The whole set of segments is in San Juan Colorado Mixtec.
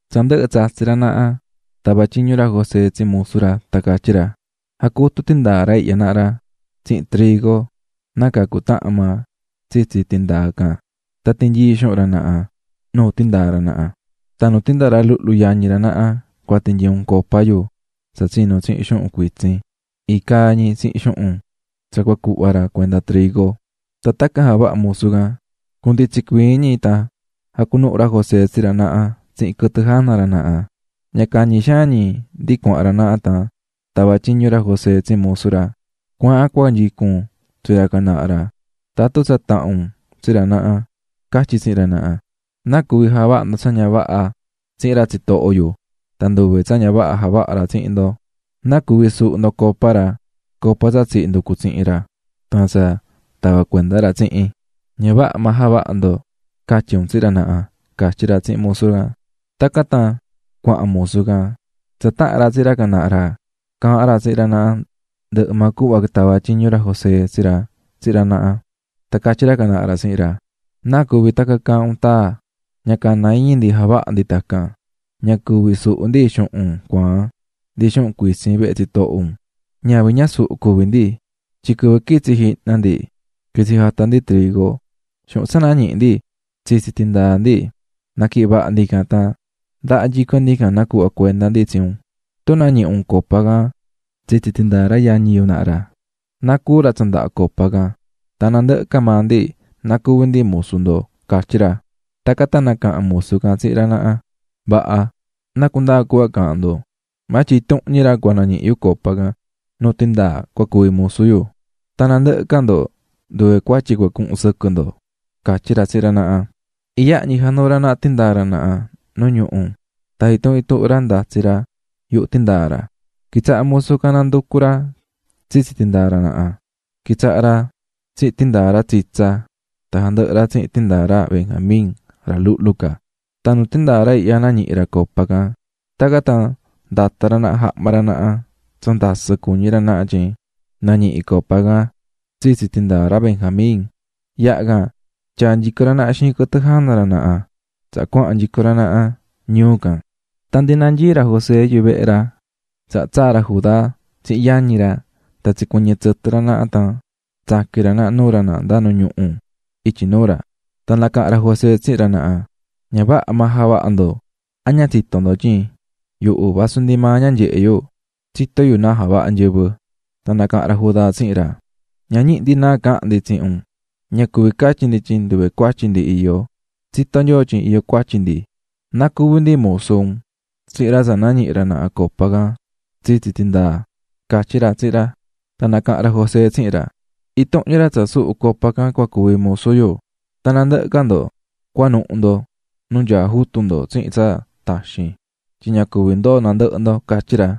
Tsa ndɨhɨ̱ tsatsi̱ ra naha, tava̱ tyiñu ra José tsi musu ra tan catyí ra: --Ja̱cutu tandɨhɨ tindaa ra ihya naha ra tsihin trigo, nácaa cutahan maa tsitsi tindaa can tan ti̱nyii xuhun ra naha nu tindaa ra naha. Tan nu tindaa ra luhlu yañi ra naha cua tinyii un copa yu tsa tsinu̱ tsihin xuhun cuitsin iin cahnu ñi tsihin xuhun tsa cua cuhva ra cuenda trigo. Tan tacan javaha̱ musu can. Cunditsin cuii ñi tan jacunuhu̱ ra José tsi ra naha tsihin quɨtɨ jana ra naha. Ña cañi xaan ñi ndi cuahan ra naha tan tava̱ tyiñu ra José tsi musu ra: --Cua̱ahan cua nyicun tsi ra can naha ra, tsa taha̱n un tsi ra naha, catyi un tsihin ra naha: ꞌ¿Náa cuví javaha̱ ndo tsa ña vaha tsihin ra tsitoho yu tan nduve tsa ña vaha javaha̱ ra tsihin ndo? ¿Náa cuví suhu̱ ndo copa ra? Copa tsa tsihí nducu tsihin ra, tan tsa tavá cuenda ra tsihin. ¡Ña vaha maa javaha̱ ndo!ꞌ, ca̱tyi un tsihin ra naha --catyí ra tsihin musu can. Tacan tan cuahan musu can, tsa taha̱n ra tsi ra can naha ra, caahán ra tsihin ra naha ndɨhɨ maa cuhva tava̱ tyiñu ra José tsi ra. Tan catyí ra can naha ra tsihin ra: --¿Náa cuví tacan caahán un taa? ¡Ña cana iñi ndi javaha ndi tacan! Ña cuví suhu ndi xuhun cuaan ndi xuhun cuitsin vehe tsitoho un, ñavin ñasuhu cuví ndi, tyin quɨvɨ quitsi̱ jihna ndi quitsi̱ jata̱ ndi trigo, xuhun tsa nañihi̱ ndi tsitsi tindaa ndi naquihi̱n vaha ndi can tan ndaha nyico ndi can nacuhva̱ cuenda ndi tsi un. Tun nañihi un copa can tsitsi tindaa ra yañi yu naha ra, na cúu ra tsa ndahá copa can, tan nandɨhɨ ca maa ndi na cuvi ndi musu ndo ―catyí ra. Tacan tan nacaha̱n musu can tsihin ra naha: --¡Vaha!, na cundaa cuhva caahán ndo, maa tyin intuhun ñi ra cua nañihi yu copa can nu tindaa cua cuvi musu yu, tan nandɨhɨ ca ndo nduve cuatyi cua cuhun sɨquɨ ndo --catyí ra tsihin ra naha. Iyaha ñi januu̱ ra naha tindaa ra naha nu ñuhu tan intuhun intuhun ra ndatsi̱ ra yuhu tindaa ra. Quitsaha̱ musu can nanducú ra tsitsi tindaa ra naha, quitsaha̱ ra tsihin tindaa ra tsitsa, tan jandɨhɨ̱ ra tsihin tindaa ra Benjamin ra luhlu ca, tan nuu tindaa ra ihya nañihi̱ ra copa can. Tacan tan ndata̱ ra naha jahma ra naha tsa ndasɨ cuñí ra naha tyin nañihi̱ copa can tsitsi tindaa ra Benjamín, yaha can tyaa̱ nyico ra naha xiin quɨtɨ jana ra naha tsaha cuahan nyico ra naha ñuu can. Tan ndi nanyií ra José yuvehe ra tsaha tsaa̱ ra Judá tsihin yañi ra tan tsicuɨñɨ̱ tsɨtɨ ra naha tan tsaqui̱n ra naha nuu ra naha nda nu ñuhu ityi nuu ra. Tan nacaha̱n ra José tsihin ra naha: --Ña vaha maa javaha̱ ndo. ¿A ña tsitó ndo tyin yuhu vasu ndi maa ña nyehe yu, tsitó yu náa javahá nyɨvɨ? Tan nacaha̱n ra Judá tsihin ra: --Ña ñihi ndi náa cahan ndi tsihin un, ña cuví catyi ndi tyin nduve cuatyi ndi iyó. Tsitó Nyoo tyin iyó cuatyi ndi, na cuvi ndi musu un tsihin ra tsa nañihi̱ ra naha copa can tsitsi tindaa --catyí ra tsihin ra. Tan nacaha̱n ra José tsihin ra: --Intuhun ñi ra tsa suhu̱ copa can cua cuvi musu yu, tan nandɨhɨ ca ndo cuanuhu ndo nu nyaá jutu ndo tsihin tsa taxin tyin ña cuvi ndoo nandɨhɨ ndo --catyí ra.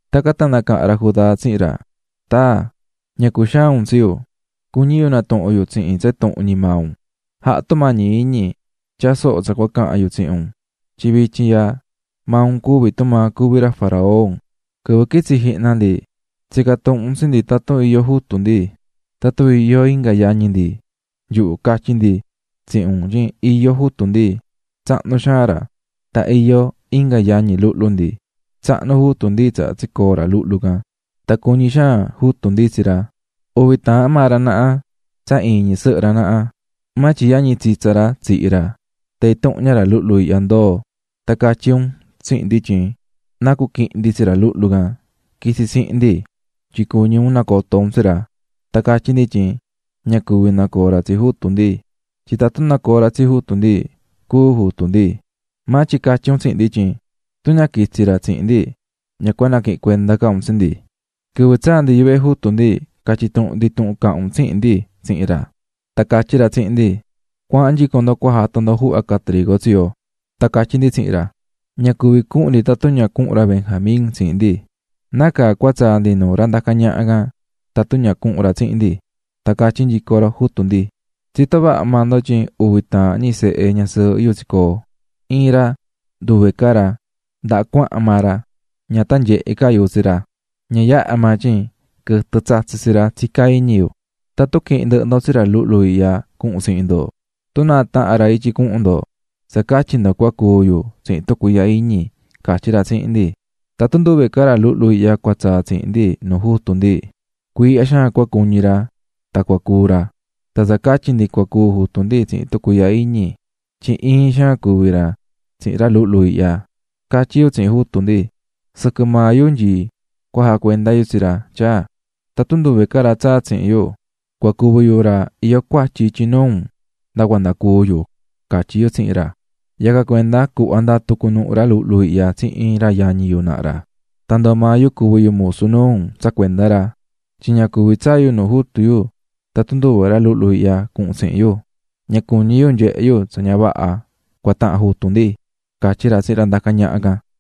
Tacan tan nacaha̱n ra Judá tsihin ra: --Taa, ña cuxaan un tsi yu, cuñí yu natuhun yu tsihin tsa intuhun ñi maa un, ja̱ha tumañi iñi tya̱a soho tsa cua cahan yu tsihin un tyin vityin ihya maa un cuví tumaa cuví ra faraón. Quɨvɨ quitsi̱ jihna ndi tsica̱ tuhun un tsi ndi tatun iyó jutu ndi, tatun iyó inga yañi ndi, nyuhu catyi̱ ndi tsihin un tyin iyó jutu ndi, tsahnu xaan ra, tan iyó inga yañi luhlu ndi. Tsahnu jutu ndi tsaha tsicoo̱ ra luhlu can, tan cuñí xaan jutu ndi tsi ra, uvi taahan maa ra naha tsa iin ñi sɨhɨ ra, maa tyin yañi tsitsa ra tsihi̱ ra, tan intuhun ña ra luhlu ihya ndoo̱. Tan catyí un tsihin ndi tyin na cuquihin ndi tsi ra luhlu can quitsi tsihin ndi tyin cuñí un nacoto un tsi ra. Tan catyí ndi tyin ña cuvi nacoo ra tsi jutu ndi, tyin tatun nacoo ra tsi jutu ndi, cúu jutu ndi. Maa tyin catyí un tsihin ndi tyin tun ña quitsi ra tsihin ndi ña cua naquihin cuenda ca un tsi ndi. "Quɨvɨ tsaa̱ ndi yuvehe jutu ndi, catyi̱ tuhun ndi tuhun caha̱n un tsihin ndi tsihin ra. Tan catyí ra tsihin ndi: 'Cua̱ahan nyico ndo cua jata ndo juhva ca trigo tsi yo.' Tan catyí ndi tsihin ra: 'Ña cuví cuhun ndi tatun ña cuhun ra Benjamín tsihin ndi, nácaa cua tsaa ndi nuu ra ndacá ñaha can tatun ña cuhun ra tsihin ndi.ꞌ Tan catyí nyico jutu ndi: 'Tsitó vaha maa ndo tyin uvi taahan ñi sehe ñasɨɨhɨ yu tsicoo̱, iin ra nduve ca ra, ndaha cuahan maa ra, ña tan nyehe ca yu tsi ra. Ña yaha maa tyin quɨtɨ tsatsi̱ tsi ra tsicá iñi yu. Tatun quihin ndɨhɨ ndo tsi ra luhlu ihya cuhun tsihin ndo tun náa tahan ra ityi cuhun ndo, tsa catyi ndo cua cúu yu tsihin tucuiihya iñiꞌ, catyí ra tsihin ndi. "Tatun nduve ca ra luhlu ihya cua tsaa tsihin ndi nuu jutu ndi, cuiihya xaan cua cuñi ra tan cua cúu ra. Tan tsa catyi ndi cua cúu jutu ndi tsihin tucuiihya iñi, tyin iin xaan cuví ra tsihin ra luhlu ihya. Catyí yu tsihin jutu ndi: ꞌSɨquɨ maa yu nyií cua jacuenda yu tsi ra, tyaa, tatun nduve ca ra tsaa tsihin yu, cua cuvi yu ra iyó cuatyi ityi nuu un nda cuanda cúu yuꞌ, catyí yu tsihin ra. Yacan cuenda cuhva ndatu cunuhu ra luhlu ihya tsihin ra yañi yu naha ra, tan ndoo maa yu cuvi yu musu nuu un tsa cuenda ra. Tyin ña cuvi tsaa yu nu jutu yu tatun nduve ra luhlu ihya cuhun tsihin yu. Ña cuñí yu nyehe yu tsa ña vaha cua tahan jutu ndi --catyí ra tsihin ra ndacá ñaha can.